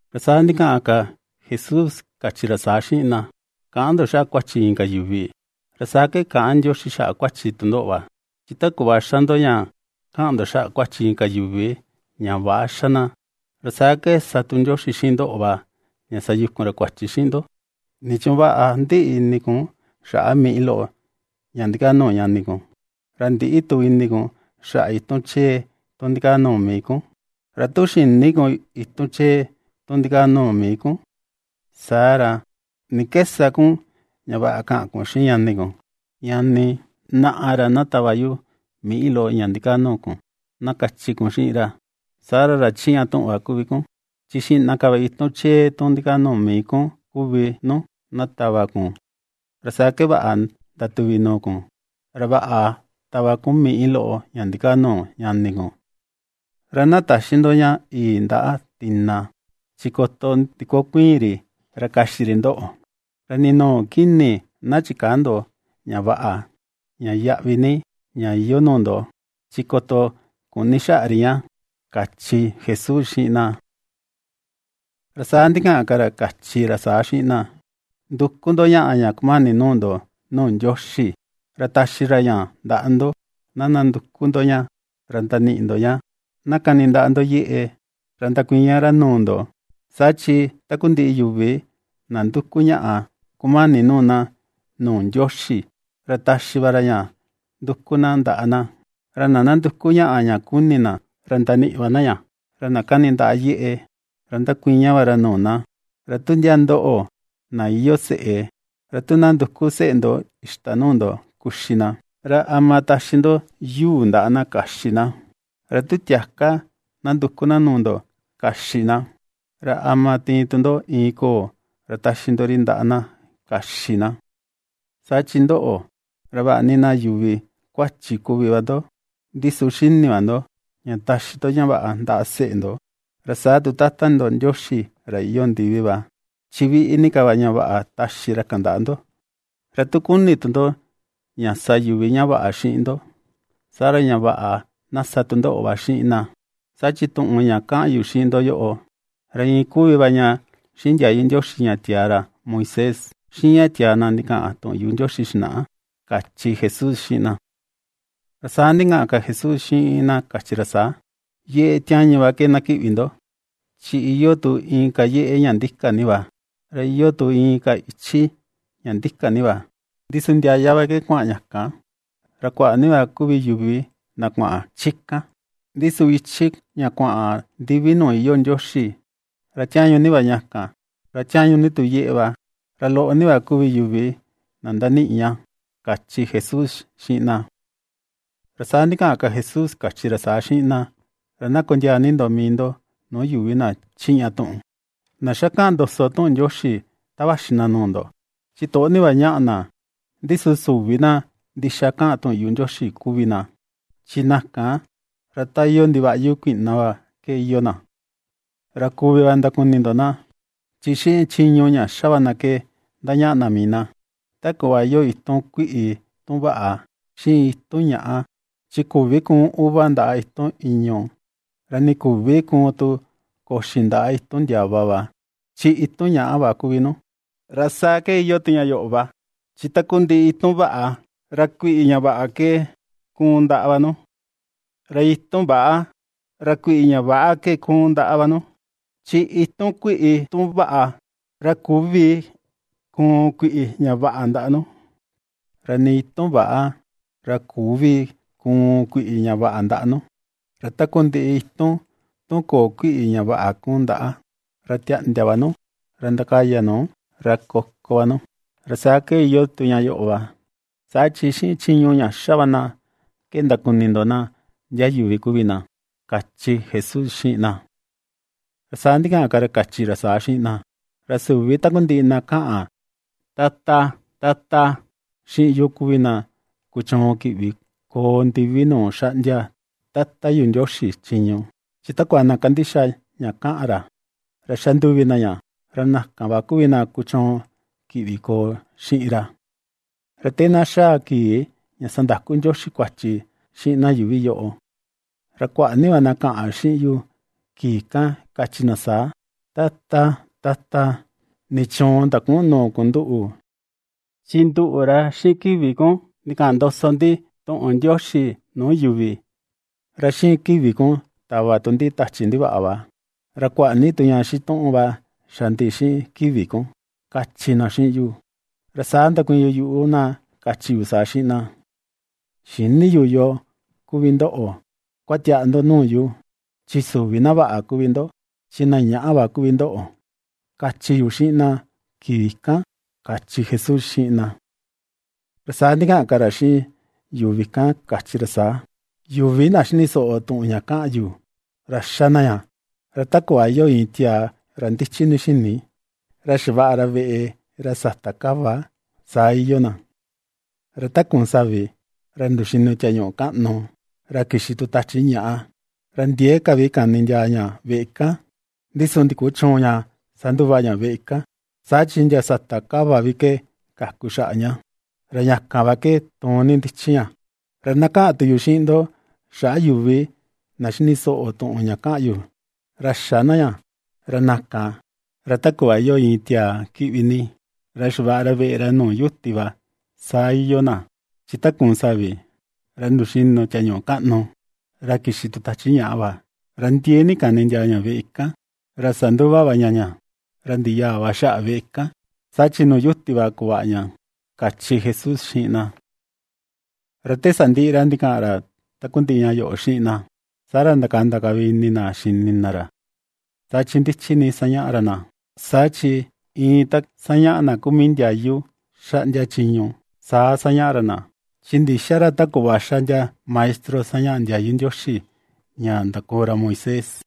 Ra saa ndikaꞌan ka Jesús kachi ra saa xiꞌin na: ―Käꞌan ndo xaꞌa kuachi inka yuvi, ra saa ke käꞌan Ndioxi xaꞌa kuachi tu ndoꞌo va. Chi ta kuꞌva xa ndo ña kaꞌan ndo xaꞌa kuachi inka yuvi ña väꞌa xa na, ra saa ke sa tu Ndioxi xiꞌin ndoꞌo va ña sayukun ra kuachi ndo. ¿Nichuun vaꞌa ndiꞌi ini kun xaꞌa miꞌi loꞌo ña ndikaa nuu ñani kun, ra ndïꞌi tu ini kun xaꞌa itun chee tun ndikaa nuu mii kun? Ra tu xïni kun itun chee tu ndikaa nuu mii kun, saa ra, ¿ni ke sa kun ña vaꞌa kaꞌan kun xiꞌin ñani kun: “Ñani, naꞌa ra na tava yu miꞌi loꞌo ña ndikaa nuu kun”, na kachi kun xiꞌin ra? Saa ra ra chiꞌña tuꞌun va kuvi kun, chi xiꞌna ka va itun chee tu ndikaa nuu mii kun kuvi nu, na tava kun. Ra saa ke vaꞌa ndatuvi nuu kun, ra vaꞌa tava kun miꞌi loꞌo ña ndikaa nuu ñani kun. ’Ra na täxi ndo ña yii ndaꞌa tina, chi koto ndikokuiin ri ra kaxi ri ndoꞌo; ra nii nuu kini na chikäa ndo ña vaꞌa, ña yaꞌvi ni, ña iyoo nuu ndo; chi koto kuꞌní xaꞌa ri ña ―kachi Jesús xiꞌin na. Ra saa ndikaꞌan ka ra kachi ra saa xiꞌin na: ―Nduku ndo ñaꞌa ña kumani nuu ndo nuu Ndioxi, ra taxi ra ña ndaꞌa ndo; na ndanduku ndo ñá, ra ndaniꞌi ndo ña; na kani ndaꞌa ndo yeꞌe, ra ndakuiña ra nuu ndo. Saa chi takundiꞌi yuvi na nduku ñaꞌa kumani nuu na nuu Ndioxi ra taxi va ra ña nduku na ndaꞌa na, ra na ndanduku ñaꞌa ña kuni na, ra ndaniꞌi va na ña. Ra na kani ndaꞌa yeꞌe, ra ndakuiña va ra nuu na. Ra tu ndiaa ndoꞌo, na iyoo seꞌe, ra tu na nduku seꞌe ndo ixta nuu ndo kuxi na, ¿ra ama taxi ndo yuu ndaꞌa na kaxi na? Ra tu tiaka, tu na nduku na nuu ndo kaxi na, ¿ra ama tiin tu ndo iin koo, ra taxi ndo ri ndaꞌa na kaxi na? Saa chi ndoꞌo, ra vaꞌa ni na yuvi kuachi kuvi va ndo, ndi su xini va ndo ña taxi ndo ña vaꞌa ndaꞌa seꞌe ndo. Ra saa tu Tata ndo Ndioxi ra iyoo ndiví va, chi viꞌi ni ka va ña vaꞌa taxi ra kan ndaꞌa ndo. ’Ra tu kuni tu ndo ña sa yuvi ña vaꞌa xiꞌin ndo, saa ra, ña vaꞌa na sa tu ndoꞌo xiꞌin va na, saa chi tuꞌun ña kaꞌan yu xiꞌin ndo yoꞌo, ra iin kuvi va ña xiꞌin ndiayu Ndioxi ña tiaa ra Moisés, xiꞌin ña tiaa na ndikaꞌan tuꞌun yuꞌu Ndioxi xinaꞌa ―kachi Jesús xiꞌin na. Ra saa ndikaꞌan ka Jesús xiꞌin na kachi ra saa: ―Yeꞌe tiañu va ke na kiꞌvi ndo, chi iyoo tu inka yeꞌe ña ndika ni va, ra iyoo tu iin ichi ña ndika ni va, ndi su ndiaya va ke kuaꞌan ña kan, ra kuaꞌa ni va kuvi yuvi na kuaꞌan chi kan. Ndi su ichi ña kuaꞌan ndiví nuu iyoo Ndioxi, ra tiañu ni va ña kan, ra tiañu ni tu yeꞌe va, ra loꞌo ni va kuvi yuvi na ndaniꞌi ña ―kachi Jesús xiꞌin na. Ra saa ndikaꞌan ka Jesús kachi ra saa xiꞌin na: ―Ra na kondiaa ni ndo mii ndo nuu yuvi na chiꞌña tuꞌun, na xá kaꞌan ndoso tuꞌun Ndioxi ta vaxi na nuu ndo, chi toꞌo ni va ñaꞌa na, ndi su süvi na ndixa kaꞌan tuꞌun yuꞌu Ndioxi kuvi na. Chi na kan ra ta iyoo ndivaꞌyu kuiꞌna va ke iyoo na. Ra kuvi va ndakuni ndo na, chi xiꞌin chiñu ña xa va na ke ndañaꞌa na mii na. Ta kuꞌva iyoo itun kuiꞌi tun vaꞌa, xiꞌin itun ñaꞌa, chi küvi kuun uva ndaꞌa itun ìñu̱, ra nii küvi kuun tu koxi ndaꞌa itun ìñu̱ ndiava va, chi itun ñaꞌa va kuvi nu. Ra saa ke iyoo tu ña yoꞌo va, chi takundiꞌi itun vaꞌa, ra kuiꞌi ña vaꞌa ke kuun ndaꞌa va nu, ra itun väꞌa, ra kuiꞌi ña väꞌa ke kuun ndaꞌa va nu. Chi itun kuiꞌi, tu vaꞌa, ra küvi kuun kuiꞌi ñàꞌa ndaꞌa nu, ra nii itun väꞌa, ra küvi kuun kuiꞌi ña vaꞌa ndaꞌa nu. Ra takundiꞌi itun tu köo kuiꞌi ña vaꞌa kuun ndaꞌa, ra tiaꞌndia va nu, ra ndakaya nu, ra koko va nu. Ra saa ke iyoo tu ña yoꞌo va, saa chi xiꞌin chiñu ña xa va na ke ndakuni ndo na ndia yuvi kuvi na ―kachi Jesús xiꞌin na. Ra saa ndikaꞌan ka ra kachi ra saa xiꞌin na: ―Ra süvi takundiꞌi na kaꞌan, “Tata, Tata”, xiꞌin yu kuvi na kuchuun kiꞌvi koo ndivi nuu xaꞌndia Tata yu Ndioxi chiñu, chi takua na kandixa ña kaꞌan ra, ra xanduvi na ña, ra na kan va kuvi na kuchuun kiꞌvi koo xiꞌin ra. Ra te na xaa kii ña sandaku Ndioxi kuachi xiꞌin na ñuu yuuvi yoꞌo, ra kuaꞌa ni va na kaꞌan xiꞌin yu kii kan kachi na saa: “Tata, Tata, ¿nichuun ndaküꞌun nuu kun nduꞌu?, chi nduꞌu, ra xiꞌin kivi kun ndikaꞌan ndoso ndi tuꞌun Ndioxi nuu yuvi, ra xiꞌin kivi kun tava tu ndi tachi ndivaꞌa va, ra kuaꞌa ni tu ña xituꞌun va xa ndi xiꞌin kivi kun”, kachi na xiꞌin yu. Ra saa ndakuiin yu yuꞌu na kachi yu saa xiꞌin na: “Xïni yu yoo kuvi ndoꞌo; kuatiaꞌa ndo nuu yu, chi süvi na vaꞌa kuvi ndo, chi na ñaꞌa va kuvi ndoꞌo”, kachi yu xiꞌin na kii kan ―kachi Jesús xiꞌin na. Ra saa ndikaꞌan ka ra xiꞌin yuvi kan kachi ra saa: ―Yuvi na xini soꞌo tuꞌun ña kaꞌan yu, ra xa na ña. Ra ta kuꞌva iyoo iin tiaa ra ndichi ni xini, ra xavaꞌa ra veꞌe ra sata kava saa iyoo na. Ra ta kuun savi, ra nduxinu tiañuꞌu kaꞌnu, ra kixi tu tachi ñaꞌa, ra ndiee ka vi kani ndiaa ña veꞌe kan, ndi su ndikuchüun ña sanduva ña veꞌe kan, saa chi ndia sata kava vi ke kaku xaꞌa ña, ra ña kan va ke tuun ni ndichi ña. Ra na kaꞌan tu yu xiꞌin ndo xaꞌa yuvi na ^xini soꞌo tuꞌun ña kaꞌan yu, ra xä na ña. Ra na kan, ra ta kuꞌva iyoo iin tiaa kiꞌvi ni, ra xavaꞌa ra veꞌe ra nuu yuti va, saa iyoo na. Chi ta kuun savi, ra nduxinu tiañuꞌu kaꞌnu, ra kixi tu tachi ñaꞌa va, ra ndiee ni kani ndiaa ña veꞌe kan, ra sanduva va ña ña, ra ndiꞌi yaa va xaꞌa veꞌe kan, saa chi nuu yuti va kuvaꞌa ña ―kachi Jesús xiꞌin na. Ra te sandiꞌi ra ndikaꞌan ra takundiꞌi ña yoꞌo xiꞌin na, saa ra ndakanda ka vi ini na xini na ra, saa chi ndichi ni ^sañaꞌa ra na. Saa chi iin ta sañaꞌá na kuu mii ndiayu, xaꞌndia chiñu, saa sañaꞌá ra na, chi ndïxa ra ta kuꞌva xa ndia maestro sañaꞌa ndiayu Ndioxi ña ndakoo ra Moisés.